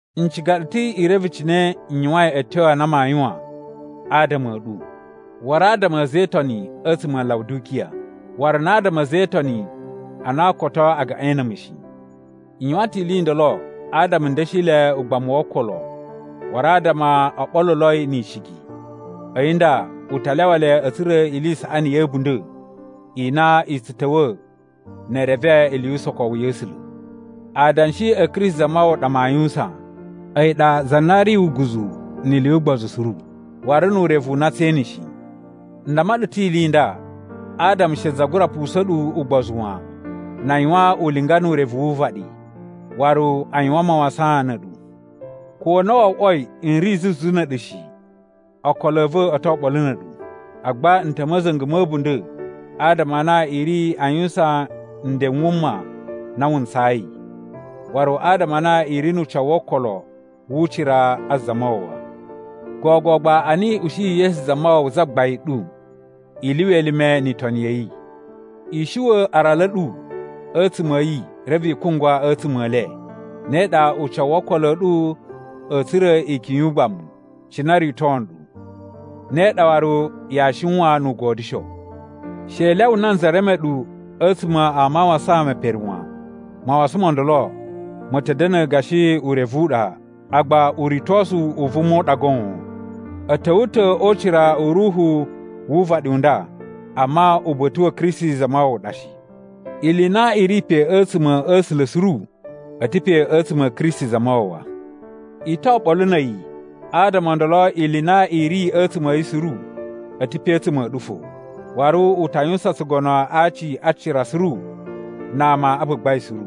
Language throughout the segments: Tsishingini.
N ciga ɗu ta̱ i reve cine n yuwain a̱tyo a na maa yuwan adama a̱ ɗu, waru adama a̱ a̱za̱ e Itoni a̱tsuma̱ a Lawudikiya, waru na adama a̱ a̱za̱ e Itoni a na koto a gaꞌain na̱ a̱mu shi. N yuwan ta̱ ili i ndolo adama n da̱shi le ugbamu wo okolo waru adama o ɓoluloi ni icigi. A̱yi nda u ta lyawa le a̱ tsura̱ ili i saꞌani ya̱ a̱bunda̱ i na i tsu ta̱wa̱ ne e reve ili yu usokowu ya̱ A̱sula̱. Adanshi a̱ Kristi Zamawawa ɗa maa yuwusan. A̱yi ɗa za na ri uguzu ni ili yu ugbozu suru waru nu urevu u na tsee ene shi. N damma ɗu ta̱ ili i nda adama she za gura pusa̱n ɗu ugbozu wan na a yuwan ulinga nu urevu wu uvaɗi, waru a yuwan mawasan na̱ a̱ɗu. Ko na wo oꞌwoi n ri zuzu na̱ a̱ɗu shi, okolo a̱ va̱ o to oɓolo na̱ a̱ɗu. Agba n ta̱ a̱ ma̱za̱nga̱ ma̱ a̱bunda̱ adama a na i ri a yuwusan nden n wuma na wu ntsayi, waru adama a na i ri nu ucawu wo okolo wu ucira a Zamawawa. Gogo gba a na i ushiyi Yesu Zamawawa, Zagbain ɗu, i lyuwa elime ni itoni ya̱ yi. I shuwa̱ aralu a̱ ɗu a̱tsuma̱ a̱ yi reve i kungwa a̱tsuma̱ e le. Ne ɗa ucawu wo okolo a̱ ɗu a̱ tsura̱ ikyun yu ugbamu, cine o rito nɗu. Ne ɗa waru yaa shiwan nu ugodyusho. She i lyawa nanza reme ɗu a̱tsuma̱ a mawasan me pere wan. Mawasan mo ndolo ma̱ ta̱ da̱na̱ gashi urevu u ɗa, agba uritosu u vuma u ɗa goon. A̱ ta̱wa̱ ta̱ o ucira u ruhu wu uvaɗi u nda amma uba̱ta̱ wa̱ Kristi Zamawawa ɗa shi. Ili i na i ri pe a̱tsuma̱ a̱ A̱sula̱ suru a̱ ta̱ pe a̱tsuma̱ a̱ Kristi Zamawawa. I to oɓolo na̱ a̱yi, adama o ndolo ili i na i ri a̱tsuma̱ yi suru a̱ ta̱ pe a̱tsuma̱ a̱ ɗu fo. Waru u ta yuwusan tsugono a aci a cira suru na ama a gbagbain suru.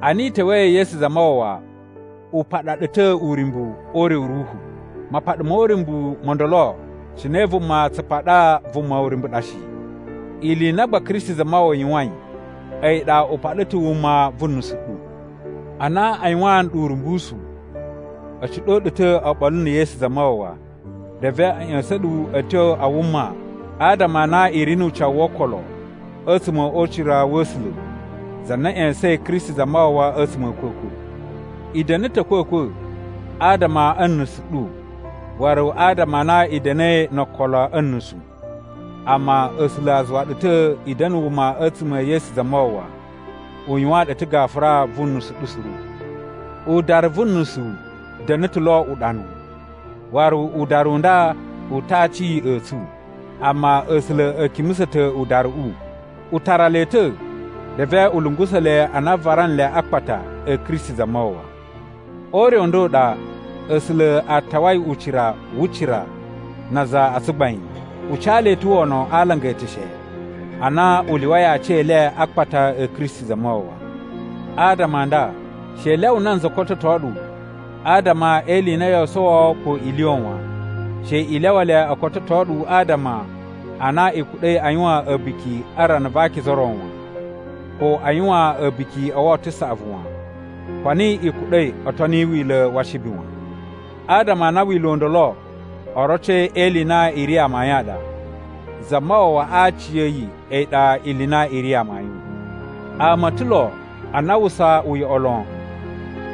Ana i ta̱wa̱i ya̱ Yesu Zamawawa u paɗa ɗu ta̱ uryumbu o ure u ruhu. Mapaɗa mo uryumbu mo ndolo cine vuma tsu paɗa vuma uryumbu ɗa shi. Ili i na gba Kristi Zamawawa yuwain a̱yi ɗa u paɗa ta̱ wuma vu nusu ɗu. Ana a yuwaan ɗu urumbusu, a̱ ciɗo ɗu ta̱ oɓolo na̱ Yesu Zamawawa. Reve a̱ ꞌya̱sa̱n ɗu a̱ tyo a wuma adama a na i ri nu ucawu wo okolo a̱tsuma̱ o ucira wa̱ A̱sula̱, za na ꞌya̱sa̱in Kristi Zamawawa a̱tsuma̱ a̱ a̱kwa̱kwa̱. I da̱na̱ ta̱ a̱kwa̱kwa̱ adama a̱ nusu ɗu waru adama a na i da̱na̱i no okolo a̱ nusu. Amma A̱sula̱ a zuwa ɗu ta̱ i da̱na̱ wuma a̱tsuma̱ e Yesu Zamawawa. U yuwaan ɗu ta̱ gafura vu nusu ɗu suru. Udaru vu nusu da̱na̱ ta̱ lo uɗanu, waru udaru u nda u ta̱ a aci a̱ tsu. Amma A̱sula̱ a̱ kimusa̱ ta̱ udaruꞌu, u tara le ta̱ reve u lungusa̱ le ana a vara nle akpata a̱ Kristi Zamawawa. O ure u nda u ɗa, A̱sula̱ a tawai ucira wu cira na aza a tsugbain. U ca le ta̱ wono a alanga e eteshe a na u lyuwai aci e le a akpata a̱ Kristi Zamawawa. Adama a nda, she i lyawa nanza kototo ɗu, adama e ili i na yoo sowo ko i lyuwa wan. She i lyawa le o kototo ɗu adama a na i kuɗa̱i a yuwan a̱buki a rana va akiza o ro wan, ko a yuwan a̱buki o Woto Saꞌavu wan, ko a na i kuɗa̱i o toni wila̱ wa Ashibi wan. Adama a na wila̱ u ndolo oroci e ili i na i ri amayun a ɗa. Zamawawa a aciya̱yi a̱yi ɗa ili i na i ri amayun. Ama o ta̱ lo a na a uwwusa uyoꞌo lon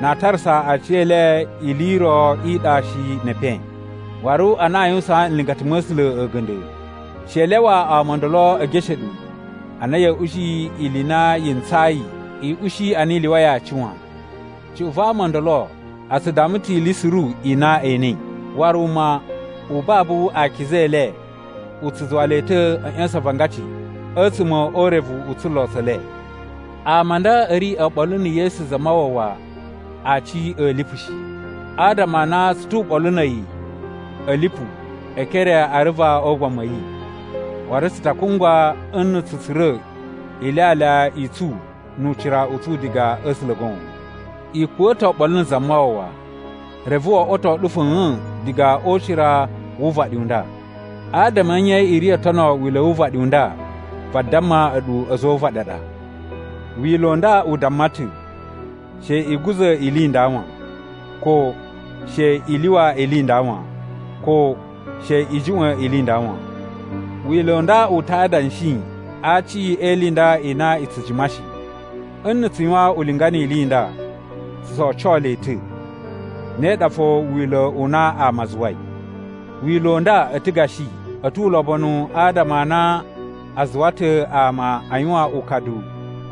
na a tarasa aciyele ili i ro i ɗa shi ne epen, waru a na yuwusaan nlingata ma̱ A̱sula̱ a̱ga̱nda̱. She i lyawa ama o ndolo e geshe ɗu ana ya̱a̱ ushi ili i na yi ntsayi i ushi a na i lyuwai aci wan. Cuꞌun va ama ndolo a tsu damma ta̱ ili suru i na e enei, waru wuma u babu a akiza e le u tsu zuwa le ta̱ a̱ ꞌya̱sa̱n avangaci a̱tsuma̱ o urevu u tsulo tsa̱ le. Ama a nda a̱ ri oɓolo na̱ Yesu Zamawawa Aci a̱ lipu shi. Adama a na tsu tu uɓolu na̱ a̱yi a̱ lipu e ekere a aruva o ugbamu a̱ yi, waru tsu ta kungwa nna̱ tsu tsura̱ ilyalya i tsu nu ucira u tsu diga a̱ A̱sula̱ goon. I kuwa̱ ta̱ oɓolo na̱ Zamawawa, reve wo oꞌwoto ɗu fa̱a̱n diga o ucira wu uvaɗi u nda. Adama a̱ nye i ri oo tono wila̱ wu uvaɗi u nda vadamma a̱ɗu a̱za̱ o uvaɗi a ɗa? Wila̱ u nda u damma ta̱, “She i guza̱ ili i nda wan!” ko “She i lyuwa ili i nda wan!” ko “She i juꞌwa̱n ili i nda wan!” Wila̱ u nda u ta adanshi a aci e ili i nda i na i tsu jima shi. Nna̱ tsu yuwan ulinga ni ili i nda, tsu tso oco le ta̱. Ne ɗa fo wila̱ u na ama a zuwai. Wila̱ u nda a̱ ta̱ gashi a̱ tu ulobonu adama a na a zuwa ta̱ ama a yuwan ukadu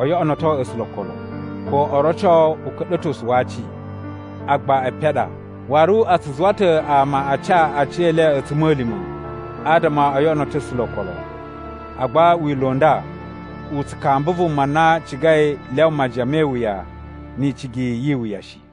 o yoꞌonoto A̱sula̱ okolo, ko o roco uka̱ɗa̱tosu wa aci. Agba epen a ɗa, waru a tsu zuwa ta̱ ama a ca aciyele a̱tsuma̱lima̱ adama o yoꞌonoto A̱sula̱ okolo. Agba wila̱ u nda u tsu kamba vuma na cigai lyawa majiyan me iwuya ni icigi yi iwuya shi.